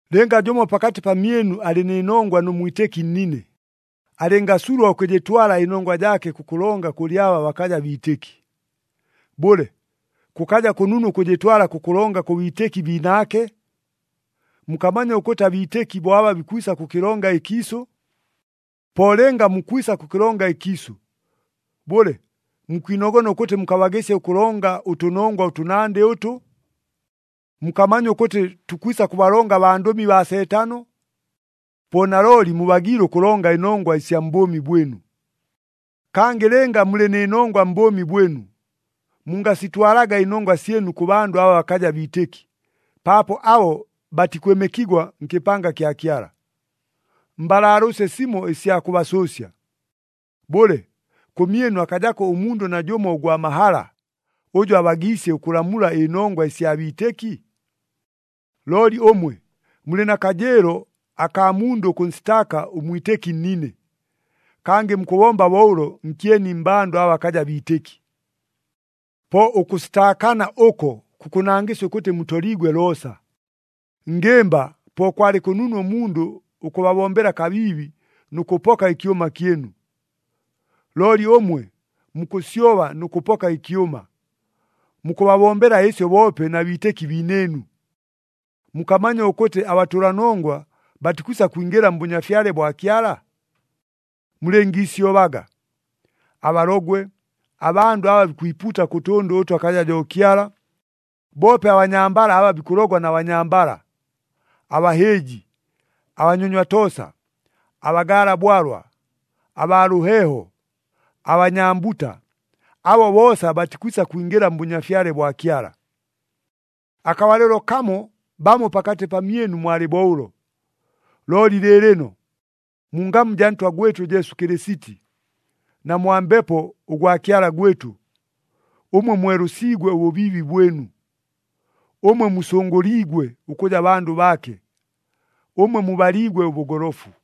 Lɨnga jʉmo pakatɨ pamyɨnu alɨ nɨ nongwa nʉ mwitɨki nnine, alɨngasulwa ʉkʉjɨtwala ɨnongwa jaake kʉkʉlonga kʉlɨ aba bakaja biitɨki. Bʉle, kʉkaja kʉnunu ʉkʉjɨtwala kʉkʉlonga kʉ biitɨki biinaake? Mukamanya ʉkʉtɨ abiitɨki bo aba bikwisa kʉkɨlonga ɨkiisʉ? Po lɨnga mukwisa kʉkɨlonga ɨkiisʉ, bʉle, mukwinogona ʉkʉtɨ mukabagɨsya ʉkʉlonga ʉtʉnongwa ʉtʉnandɨ ʉtʉ? Mukamanya ʉkʉtɨ tukwisa kʉbalonga abandʉmi baa Seetano? Po nalooli mubagiile ʉkʉlonga ɨnongwa ɨsya mbʉʉmi bwɨnu! Kangɨ lɨnga mulɨ nɨ nongwa mbʉʉmi bwɨnu, mungasitwalaga ɨnongwa syɨnu kʉ bandʉ aba bakaja biitɨki, paapo abo batikwɨmɨkigwa nkɨpanga kya Kyala. Mbalaalʉʉsye simo ɨsya kʉbasʉʉsya. Bʉle, kʉmyɨnu akajako ʉmundʉ najʉmo ʉgwa mahala, ʉjʉ abagiisye ʉkʉlamula ɨnongwa ɨsya biitɨki? Looli ʉmwe, mulɨ na kajɨɨlo akaa mundʉ ʉkʉnsitaaka ʉmwitɨki nnine! Kangɨ mukʉbomba bo ʉlo nkyeni mmbandʉ aba bakaja biitɨki! Po ʉkʉsitaakana ʉko kukʉnangɨsya ʉkʉtɨ mutoliigwe loosa! Ngɨmba, po kwalɨ kʉnunu ʉmundʉ ʉkʉbabombela kabiibi nʉ kʉpoka ɨkyʉma kyɨnu! Looli ʉmwe, mukʉsyoba nʉ kʉpoka ɨkyʉma, mukʉbabombela ɨsyo boope na biitɨki biinɨɨnu! Mukamanya ʉkʉtɨ abatʉlanongwa batikwisa kwingɨla mBʉnyafyale bwa Kyala? Mulɨngiisyobaga! Abalogwe, abandʉ aba bikwipuuta kʉ tʉndʉ ʉtʉ akaja jo Kyala, boope abanyambala aba bikʉlogwa na banyambala, abahɨɨji, abanyonywa toosa, abagaala bwalwa, abaa lʉheeho, abanyambuta, abo boosa batikwisa kwingɨla mBʉnyafyale bwa Kyala. Akabalɨlo kamo bamo pakatɨ pamyɨnu mwalɨ bo ʉlo. Looli lɨɨlɨno, mu ngamu jaa Ntwa gwɨtʉ Jesu Kɨlɨsiti, na mwa Mbepo ʉgwa Kyala gwɨtʉ, ʉmwe mwelʉsiigwe ʉbʉbiibi bwɨnu, ʉmwe musʉngʉliigwe ʉkʉja bandʉ baake, ʉmwe mubaliigwe ʉbʉgolofu.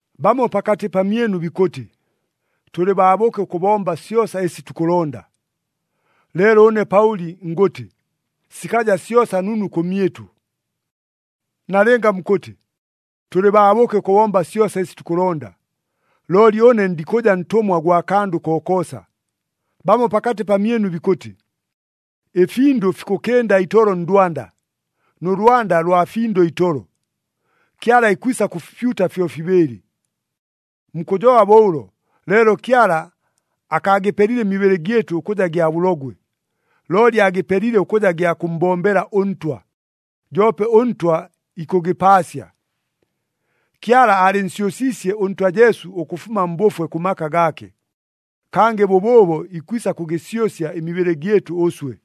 Bamo pakatɨ pamyɨnu bikʉtɨ, “Tʉlɨ baabʉke ʉkʉbomba syosa ɨsi tukʉlonda,” leelo ʉne Paʉli ngʉtɨ, sikaja syosa nunu kʉmyɨtʉ. Nalɨnga mukʉtɨ, “Tʉlɨ baabʉke ʉkʉbomba syosa ɨsi tukʉlonda,” looli ʉne ndikʉja ntʉmwa gwa kandʉ kokoosa. Bamo pakatɨ pamyɨnu bikʉtɨ, “Ɨfindʉ fikʉkɨnda itolo ndwanda, nʉ lwanda lwa findʉ itolo. Kyala ikwisa kʉfipyuta fyofibɨɨlɨ.” Mukʉjoba bo ʉlo, leelo Kyala akaagɨpelile ɨmibɨlɨ gyɨtʉ ʉkʉja gya bʉlogwe, looli aagɨpelile ʉkʉja gya kʉmmbombela ʉNtwa, joope ʉNtwa ikʉgɨpaasya. Kyala aalɨnsyʉsiisye ʉNtwa Jesu ʉkʉfuma mbʉfwe kʉ maka gaake. Kangɨ bʉbʉʉbo ikwisa kʉgɨsyʉsya ɨmibɨlɨ gyɨtʉ ʉswe.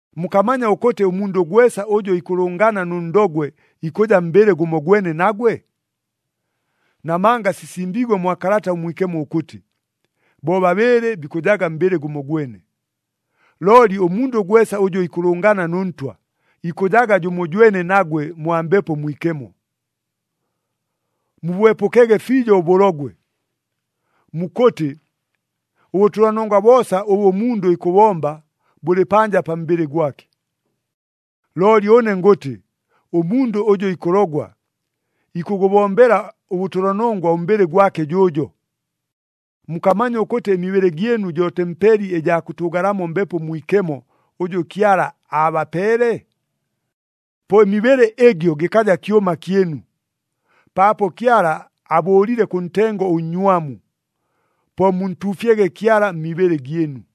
Mukamanya ʉkʉtɨ ʉmundʉ gwesa ʉjʉ ikʉlʉngana nʉ ndogwe ikʉja mbɨlɨ gʉmogwene nagwe? Namanga sisimbiigwe mwa Kalata ʉMwikemo ʉkʉtɨ, “Bobabɨɨlɨ bikʉjaga mbɨlɨ gʉmogwene.” Looli ʉmundʉ gwesa ʉjʉ ikʉlʉngana nʉ Ntwa, ikʉjaga jʉmojwene nagwe mwa Mbepo Mwikemo. Mubwepʉkege fiijo ʉbʉlogwe. Mukʉtɨ, “Ʉbʉtʉlanongwa boosa ʉbʉ ʉmundʉ ikʉbʉbomba, bʉlɨ panja pa mbɨlɨ gwake,” looli ʉne ngʉtɨ, ʉmundʉ ʉjʉ ikʉlogwa, ikʉgʉbombela ʉbʉtʉlanongwa ʉmbɨlɨ gwake jʉʉjo. Mukamanya ʉkʉtɨ ɨmibɨlɨ gyɨnu jo tempeli ɨjaa kʉtʉʉgalamo Mbepo Mwikemo, ʉjʉ Kyala aabapeele? Po ɨmibɨlɨ ɨgyo gɨkaja kyʉma kyɨnu, paapo Kyala abʉʉlile kʉ ntengo ʉnnywamu. Po muntuufyege Kyala mmibɨlɨ gyɨnu.